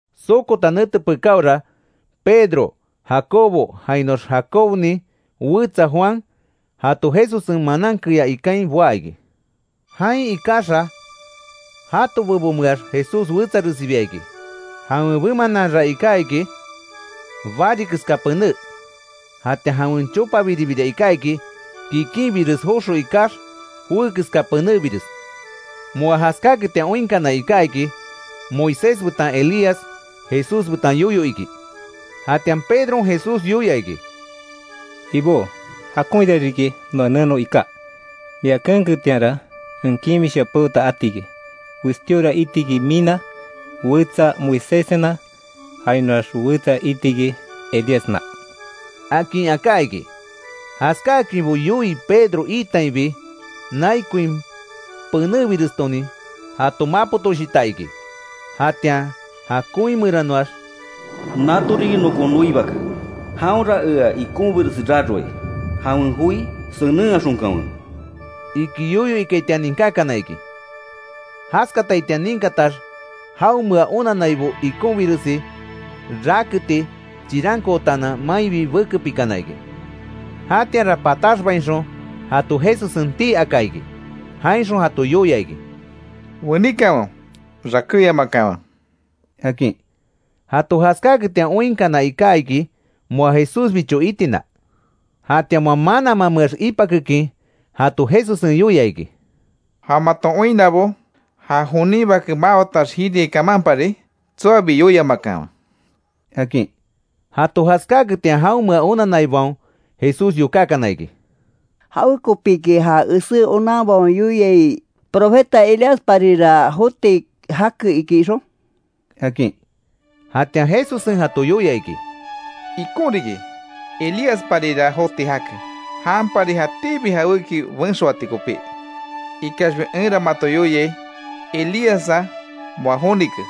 Sokota nete pekáora, Pedro, Jacobo jainoax Jacobonin wetsa Juan, jato Jesussen manan keyá ikain boá iki. Jain ikaxa, jato bebomeax Jesús wetsaresibia iki. Jawen bemananra iká iki bari keska pené. Jatian jawen chopabiribira iká iki, kikinbires joxo ikax, joé keska penébires. Moa jaskáketian oinkana iká iki, Moisés betan Elías Jesús betan yoyo iki. Jatian Pedron Jesús yoia iki: —Ibó, jakonhira riki noa neno iká. Mia keenketianra, en kimisha peota atiki; westíora itiki mina; wetsa Moiséssena; jainoax wetsa iti iki, Elíasna —akin aká iki. Jaskáakinbo yoii Pedro itainbi, nai koin penébirestonin, jato mapotoshita iki. Jatian ja koin meranoax: “Nato riki nokon noi Bake, jaonra ea ikonbiresi raroai, jawen joi senenhaxonkanwe”, iki yoyo ikaitian ninkákana iki. Jaskataitian ninkatax, jaonmea onannaibo ikonbiresi raketi chirankootaanan mainbi bekepikana iki. Jatianra pataxbainxon jato Jesussen tii aka iki. Jainxon jato yoia iki: —Weníkanwe, rakéyamakanwe —akin. Jato jaskáketian oinkana iká iki moa Jesúsbicho itina. Jatian moa mananmameax ipakekin, jato Jesussen yoia iki: —Ja maton oinnabo, ja jonin Bake mawatax jiriai kamanpari tsoabi yoiamakanwe —akin. Jato jaskáketian jaonmea onanaibaon Jesús yokákana iki: —¿Jawekopíki ja esé onanbaon yoiai, profeta Elíasparira joti jake iki ixon? —akin. Jatian Jesussen jato yoia iki: —Ikon riki. Elíasparira joti jake, janpari jatíbi jawéki benxoati kopí. Ikaxbi enra mato yoiai, Elíassa moa jonike.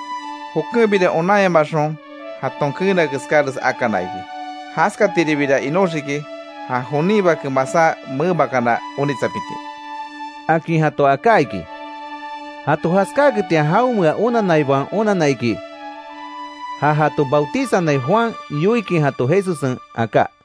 Jokenbira, onanyamaxon jaton keena keskáres akana iki. Jaskatiribira inoxiki, ja jonin Bake, masá memakana onitsapiti —akin jato aká iki. Jato jaskáaketian, jaonmea onanaibaon onanna iki, ja jato bautizanai Juan yoikin jato Jesussen aká.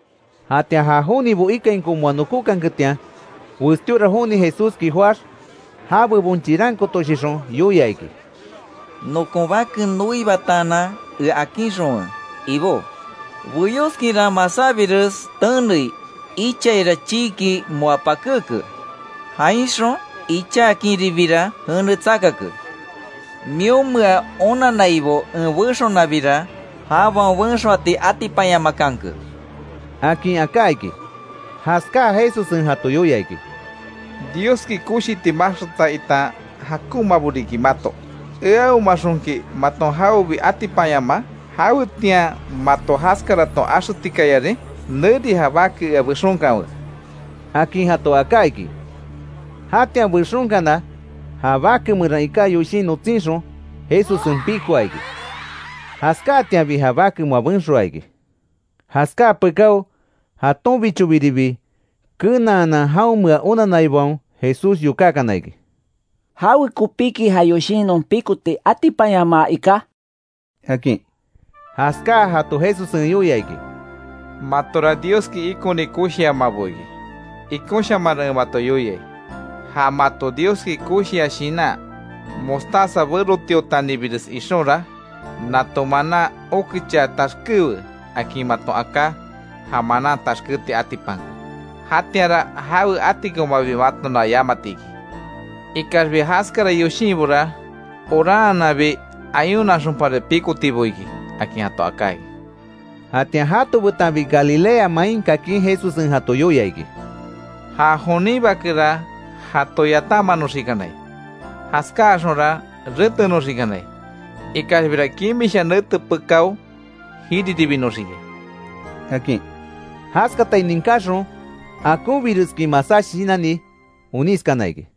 Jatian ja jonibo ikainko moa nokókanketian, westíora joni Jesúski joáx, ja bebon chirankootoshixon yoia iki: —Nokon bake noibataanan ea akinxonwe, Ibó. Beyóskinra masábires tenei. Ichaira chiiki moa pakéke. Jainxon, ichakinribira jene tsakake. Mionmea onannaibo en bexonabira, jabaon benxoati atipanyamakanke —akin aká iki. Jaskáa, Jesussen jato yoia iki: —Dioski koshiti maxkata itan jakonmabo riki mato. ¿Eahomaxonki maton jawebi atipanyamaa? ¿Jawetian mato jaskaraton axetikayarin? Neri ja bake ea bexonkanwe —akin jato aká iki. Jatian bexonkana, ja bake meran iká yoshin notsínxon Jesussen pikoa iki. Jaskáatianbi ja bake moa benxoa iki. Jaskáa pekáo, jatonbichobiribi kenaanan jaonmea onanaibaon Jesús yokákana iki. —¿Jawekopiki ja yoshin non pikoti atipanyamaa ika? —akin. Jaskáa, jato Jesussen yoia iki: —Matora Dioski ikoni koshiamabo iki. Ikonshamanra en mato yoiai; ja mato Dioski koshia shinan, mostaza berotiotanibires ixonra, ‘Nato manan, okechaa taxkéwe akin maton aká, ja manan taxkéti atipanke’. Jatianra jawe atikomabi matona yamatiki. [Ikaxbi jaskara yoshinbora, oranhananbi, ayunaxonpari pikotibo iki —akin jato aká iki] Jatian jato betanbi Galilea main kakin, Jesussen jato yoia iki: —Ja jonin Bakera, jato yatanmanoxikanai. Jaskáaxonra retenoxikanai. Ikaxbira, kimisha nete pekáo jiriribinoxiki —akin. Jaskatai ninkaxon, akonbireskin masá shinanni onískana iki.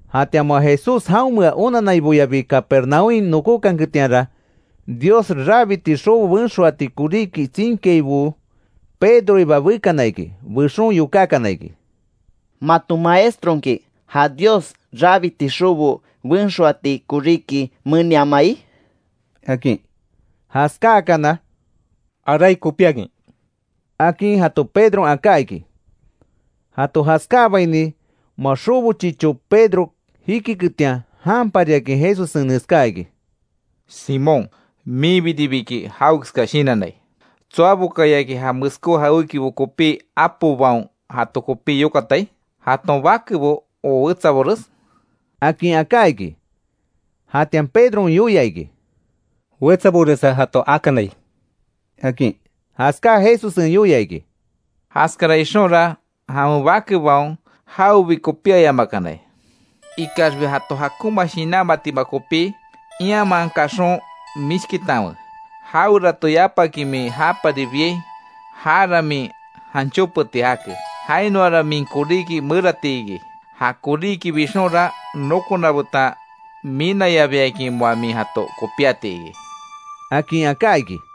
Jatian moa Jesús jaonmea onanaiboyabi, Capernaúmhain nokókanketianra, Dios rabiti xobo benxoati koríki tsinkiaibo Pedroiba bekana iki. Bexon yokákana iki: —¿Maton maestronki, ja Dios rabiti xobo benxoati koríki meniamai? —akin. Jaskáakana; —Arai kopíakin —akin jato Pedron aká iki. Jato jaskáabaini moa xobo chicho Pedro jikiketian, janpariakin Jesussen neskáa iki: —Simón minbiribiki jawekeska shinannai ¿Tsoabokayaki, ja meskó jawékibo kopí apobaon jato kopí yokatai? ¿Jaton bakebo, ó wetsabores? —akin aká iki. Jatian Pedron yoia iki: —Wetsaboresa jato akanai —akin. Jaskáa Jesussen yoia iki: —Jaskara ixonra, jawen bakebaon jawebi kopíayamakanai. Ikaxbi, jato jakonma shinanmatima kopí, ianman kaxon mishkitanwe. Jawerato yapaki min japari biai, jara min janchópeti jake, jainoara min koríki merati iki. Ja koríki bixonra, nokona betan minayabiakin moa min jato kopíati iki —akin aká iki.